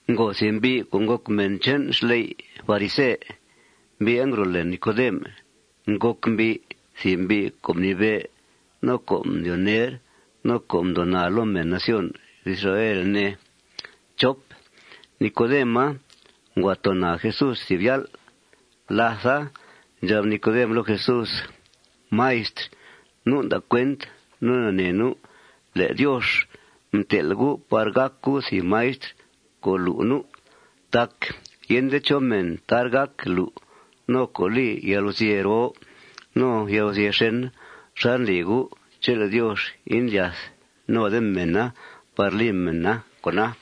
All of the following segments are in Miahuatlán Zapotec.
Ngo thìb mbi' co' ngòc mèn che'n xley' farise. Mbi'a ngro' lèe Nicodem. Ngòc mbi' thìb mbi' co' mnibe', no co' mdyoo ner, no co' mdyoo naa loo mèn nación Israel, ne. Nicodema ngua too naa Jesús thìb yál'. Látha, ndxab Nicodem loo Jesús: ―Maistr, nu' nda' cuent no nanee nu' le' Diox mtel' U' par gàc U' thìb maistr co' lu' nu'. Tac yende chó mèn tar gác lu' no co' li yalguzye' roo no yalguzye' xèn xal ndli U' chele' Diox indlyath node mèna par li mèna con'a.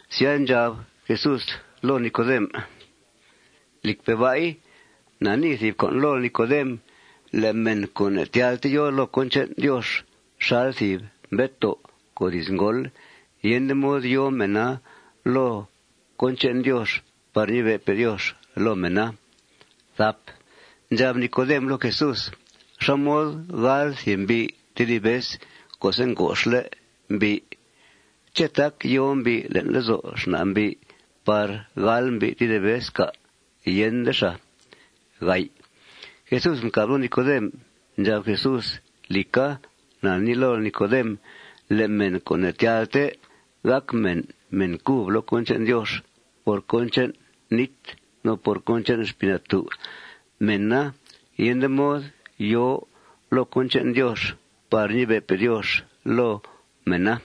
Sya, ndxab Jesús loo Nicodem: ―Lìcpe' ba'i, na nii thìb con' lool, Nicodem: Le' mèn co' ne'tyalte yòo loo cón che'n Diox xal thìb mbetoo' co' diz ngóol, yende mod yòo mèna loo cón che'n Diox par ñibe'pe' Diox loo mèna. Ndxab Nicodem loo Jesús: ―¿Xá mod gáal thìb mbi' tedib vez co'se' ngoxle' mbi'? ¿Ché' tác yòo mbi' le'n lezo' xna' mbi' par gáal mbi' tedib vez, cà'? Yende xàa. Jesús mcàb loo Nicodem. Ndxab Jesús: ―Lìca, na nii lool, Nicodem: Le' mèn co' ne'tyalte gàc mèn men cub loo cón che'n Diox por cón che'n nít no por cón che'n Xpii Natú', mèna yende mod yòo loo cón che'n Diox par ñibe'pe' Diox loo mèna.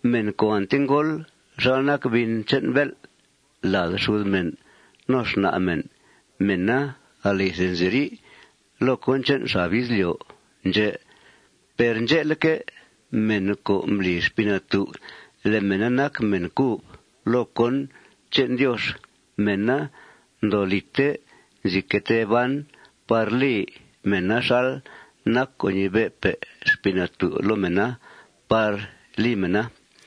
Mèn co' ante ngóol xal nac bin che'n bél' lad xud mèn no xna' mèn, mèna alithe nziri' loo cón che'n xab izlyo' ndxè'. Per ndxe'leque', mèn co' mbli Xpii Natú' le' mèna nac mèn cub loo cón che'n Diox, mèna ndoo lìte nzi que tee ban par li mèna xal nac co' ñibe'pe' Xpii Natú' loo mèna par li mèna.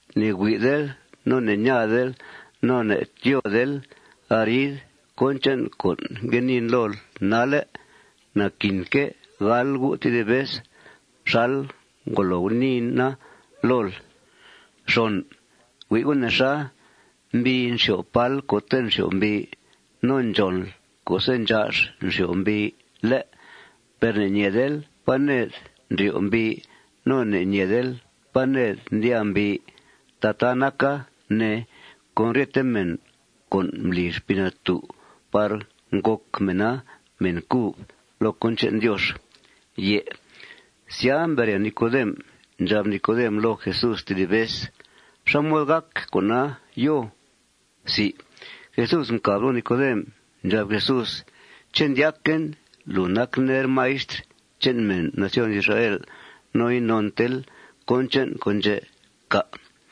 Ne'hui'del, no ne'ñaadel, no ne'tyóodel arid cón che'n con' ngue niin lool nalle'. Naquinque' gáal gu' tedib vez xal ngolo guniina lool. Hui' nexa. Mbii nxyo'f pál co'te' nxyo'f mbii. No ndxònl co'se' ndxa'x nxyo'f mbii, ¿lé'? Per ne'ñeedel pá ned ndryo' mbii. No ne' ne' ñeel pá ned ndyàa mbii. Tataa naca, ne, con ryete mèn co' mbli Xpii Natú' par ngòc mèna mèn cub loo cón che'n Diox. Sya, mbere Nicodem, ndxab Nicodem loo Jesús tedib vez: ―¿Xá mod gàc con'a, yoo? Jesús mcàb loo Nicodem. Ndxab Jesús: ―¿Ché' ndyaquen lùu nac ner maistr che'n mèn nación Israel no inontel cón che'n con' ndxè', cà'?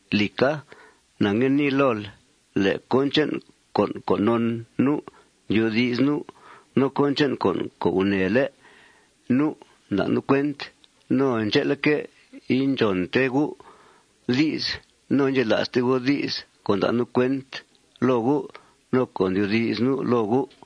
Lìca, na ngue nii lool: Le' cón che'n con' co' non nu', ndyoodi's nu'. No cón che'n con' co' gunèele' nu', nda' nu' cuent. No ndxe'leque', indxònte gu' di's no indxela'ste gu' di's co' nda' nu' cuent loo gu' no co' ndyoodi's nu' loo gu'.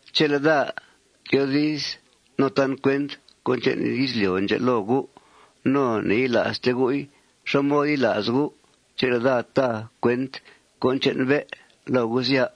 Chele' daa tyoodiz no tan cuent cón che'n izlyo' ndxè' loo gu' no ne'yila'ste gu'i, ¿xá mod yila's gu' chele' daa ta cuent cón che'n bé' loo gu', sya?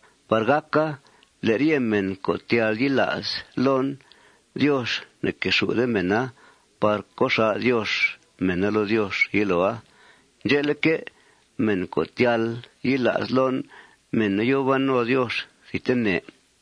par gàca le' ryete mèn co' tyal yila's loon, Diox ne'quexù'de mèna par co' xà' Diox mèna loo Diox yiloa. Ndxe'leque', mèn co' tyal yila's loon, mèna yòo ban no Diox thidtene.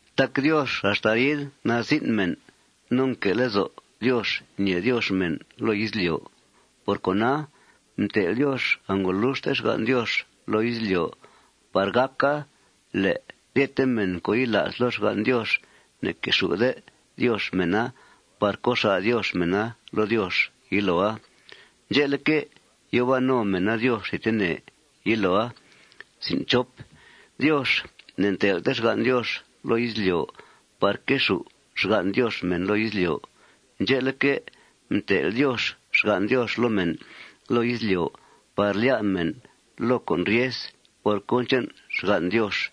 Tac Diox axta arid nazin' mèn no nque' lezo' Diox ñèe Diox mèn loo izlyo'. Por cona, mtel' Diox angoluxte xgan' Diox loo izlyo' par gàca le' ryete mèn co' yila's loo xgan' Diox, ne'quexù'de Diox mèna par co' xà' Diox mèna loo Diox yiloa. Ndxe'leque', yòo ban no mèna Diox thidtene yiloa. Diox ne'ntel'te xgan' Diox loo izlyo' par quexù' xgan' Diox mèn loo izlyo'. Ndxe'leque', mtel' Diox xgan' Diox loo mèn loo izlyo' par lyá' mèn loo con' ryes por cón che'n xgan' Diox.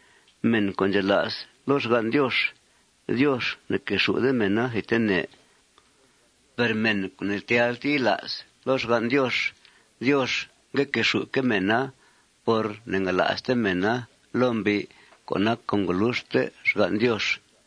Mèn co' ndxela's loo xgan' Diox, Diox ne'quexù'de mèna thidtene. Per mèn co' ne'tyalte yila's loo xgan' Diox, Diox ngue quexù'que' mèna por ne'ngala'ste mèna loo mbi' co' nac angoluxte xgan' Diox.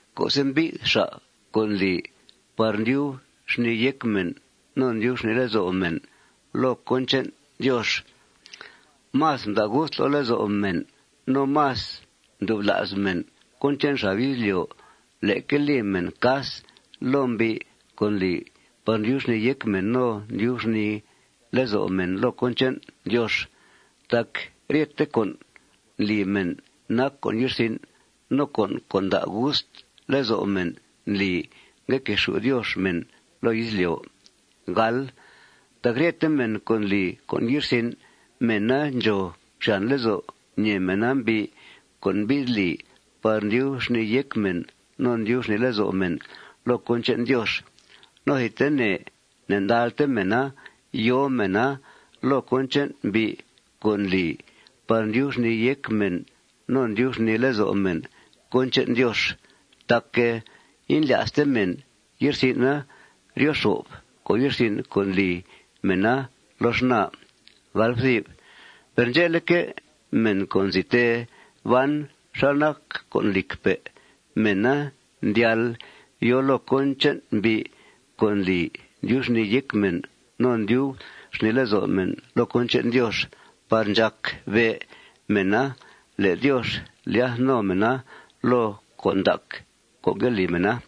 Co'se' mbi'th xa' co' ndli par ndyub xnìi yéc mèn no ndyub xnìi lezo' mèn loo cón che'n Diox, más mda' gust loo lezo' mèn no más mdubla's mèn cón che'n xab izlyo' leque li mèn cas loo mbi' co' ndli par ndyub xnìi yéc mèn no ndyub xnìi lezo' mèn loo cón che'n Diox. Tac ryethe con' ndli mèn nac con' ye'rsin'. No con' co' nda' gust lezo' mèn ndli ngue quexù' Diox mèn loo izlyo'. Tac ryete mèn co' ndli con' ye'rsin', mèna ndxòo xyàn lezo' ñèe mèna mbi' co' mbi'th li par ndyub xnìi yéc mèn no ndyub xnìi lezo' mèn loo cón che'n Diox. No thidtene ne'ndalte mèna yòo mèna loo cón che'n mbi' co' ndli par ndyub xnìi yéc mèn no ndyub xnìi lezo' mèn cón che'n Diox tac indlya'ste mèn ye'rsin'a ryo xo'f con' ye'rsin' co' ndli mèna loo xnaa. Per ndxe'leque', mèn co' nzi tee ban xal nac con' lìcpe', mèna ndyal yòo loo cón che'n mbi' co' ndli ndyub xnìi yéc mèn no ndyub xnìi lezo' mèn loo cón che'n Diox par ndxàc be' mèna le' Diox ndlyath no mèna loo con' ndac co' ngue li mèna.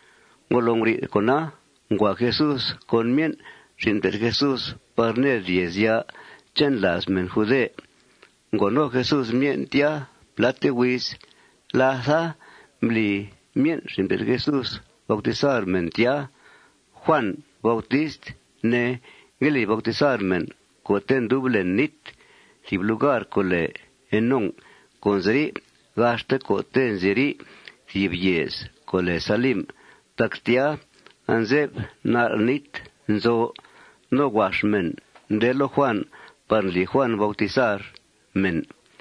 Ngolo nguri'th con'a, ngua Jesús con myen' xin' mté'th Jesús par ned yèezya' che'n làaz mèn jude. Ngo no Jesús myen' tya pláte huiz. Látha, mbli myen' xin' mté'th Jesús bautizar mèn tya. Juàn Bautist, ne, ngue li bautizar mèn co'te' ndub len nít thìb lugar co' lèe Enón co' nziri' gaxte co'te' nziri' thìb yèez co' lèe Salim tac tya anze'f nal' nít nzo. No huax mèn nde loo Juàn par ndli Juàn bautizar mèn.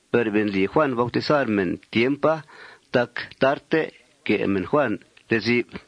Be' ndli Juàn bautizar mèn tiempa tac tarte que' mèn Juàn lezi'f.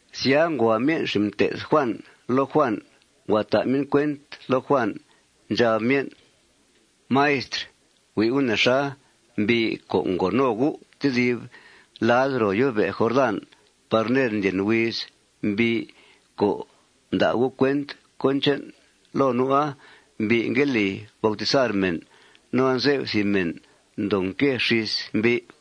Sya, ngua myen' xin' mté'th Juàn loo Juàn. Ngua ta' myen' cuent loo Juàn. Ndxab myen': ―Maistr, hui' U' nexa. Mbi' co' ngo no U' tedib lad ro yó'be' Jordán par ned ndlyen huiz, mbi' co' mda' U' cuent cón che'n loo nu'a, mbi' ngue li bautizar mèn. No anze'f thìb mèn ndoo nque xís mbi'.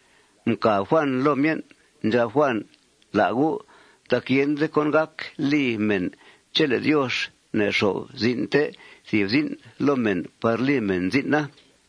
Mcàb Juàn loo myen'. Ndxab Juàn: ―La' gu'. Tac yende cón gác li mèn chele' Diox ne'nxo'f zin'te thìb zin' loo mèn par li mèn zin'a.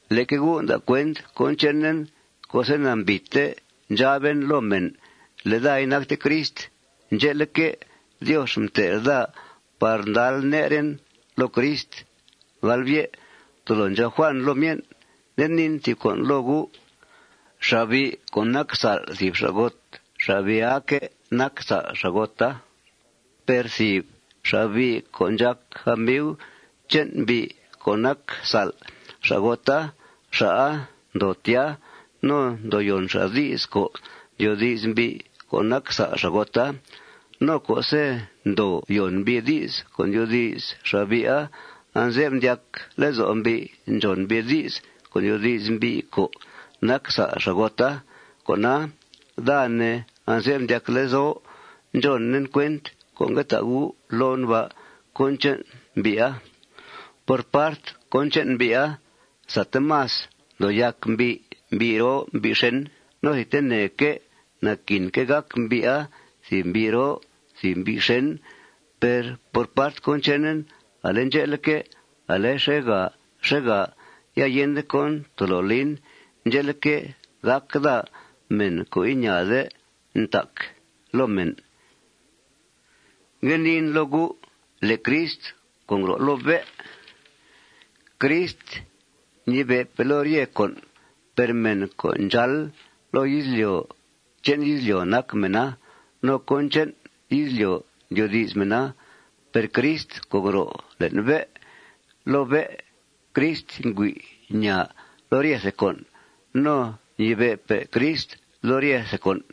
Leque gu' nda' cuent cón chenen co'se' nambìite ndxaben loo mèn le' daa inacte Crist. Ndxe'leque', Diox mtel' daa par ndal neren loo Crist. Tolo ndxab Juàn loo myen': ―Nde niin thìb con' loo gu': Xa'bi' co' nac sa'l thìb xa'got, xa'bi'aque' nac sa'l xa'gota. Per thìb xa'bi' co' ndxàc amiu che'n mbi' co' nac sa'l xa'gota, xa'a ndoo tya. No ndoo yòn xa' di's co' ndyoodi's mbi' co' nac sa'l xa'gota. No co'se' ndoo yòn mbi' di's co' ndyoodi's xa'bi'a, anze'f ndyac lezo' mbi' ndxòn mbi' di's co' ndyoodi's mbi' co' nac sa'l xa'gota. Cona, daa, ne, anze'f ndyac lezo' ndxònen cuent co' ngue ta' gu' loon ba' cón che'n mbi'a. Por part cón che'n mbi'a, sate más ndoo yàc mbi' mbi' roo mbi' xèn. No thidteneque' naquinque' gàc mbi'a thìb mbi' roo thìb mbi' xèn. Per part cón chenen, ale ndxe'leque', ale xèegà xèegà ya yende cón tolo lin. Ndxe'leque', gàc daa mèn co' iñaade ntac loo mèn. Ngue niin loo gu': Le' Crist co' ngro' loo bé', Crist ñibe'pe' loo ryethe con'. Per mèn co' ndxáal loo izlyo', che'n izlyo' nac mèna. No cón che'n izlyo' ndyoodi's mèna. Per Crist co' ngro' le'n bé' loo bé', Crist ngüi' ñaa loo ryethe con'. No ñibe'pe' Crist loo ryethe con'.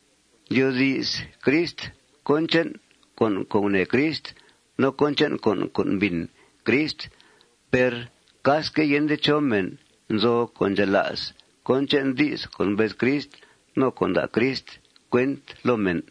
Ndyoodi's Crist cón che'n con' co' gunèe Crist no cón che'n con' co' mbìn Crist. Per casque yende chó mèn nzo' co' ndxela's cón che'n di's co' mbez Crist no co' nda' Crist cuent loo mèn.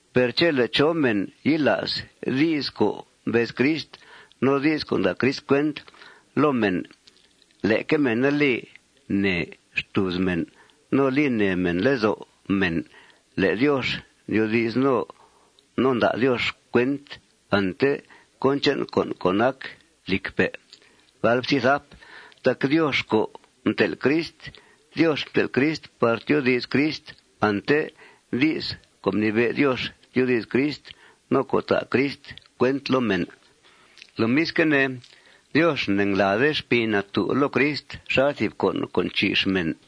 Per chele' chó mèn yila's di's co' mbez Crist no di's co' nda' Crist cuent loo mèn, leque mèna li nèe xtùuz mèn no li nèe mèn lezo' mèn le' Diox ndyoodi's no nda' Diox cuent ante cón che'n con' co' nac con' lìcpe'. Tac Diox co' mtel' Crist, Diox mtel' Crist par tyoodi's Crist ante di's co' mnibe' Diox tyoodi's Crist no co' ta' Crist cuent loo mèn. Lomisque' ne, Diox ne'nglàade Xpii Natú' loo Crist xal thìb con' co' nchi'x mèn.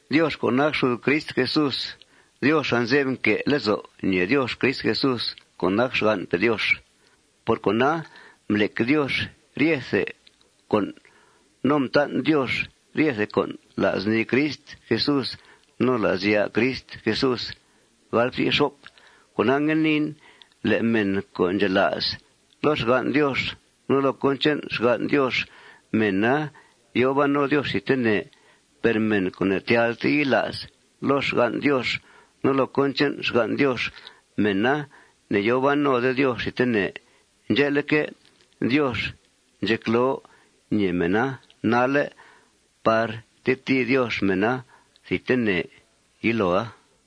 Diox co' nac xud Crist Jesús, Diox anze'f nque' lezo' ñèe Diox Crist Jesús co' nac xgan'pe' Diox. Por cona, mblec Diox ryethe con' no mtan' Diox ryethe con' la's nii Crist Jesús no la's ya' Crist Jesús. Cona, ngue niin: Le' mèn co' ndxela's loo xgan' Diox no loo cón che'n xgan' Diox, mèna yòo ban no Diox thidtene. Per mèn co' ne'tyalte yila's loo xgan' Diox no loo cón che'n xgan' Diox, mèna ne'yòo ban node Diox thidtene. Ndxe'leque', Diox ndxecloo ñèe mèna nalle' par tetìi Diox mèna thidtene yiloa.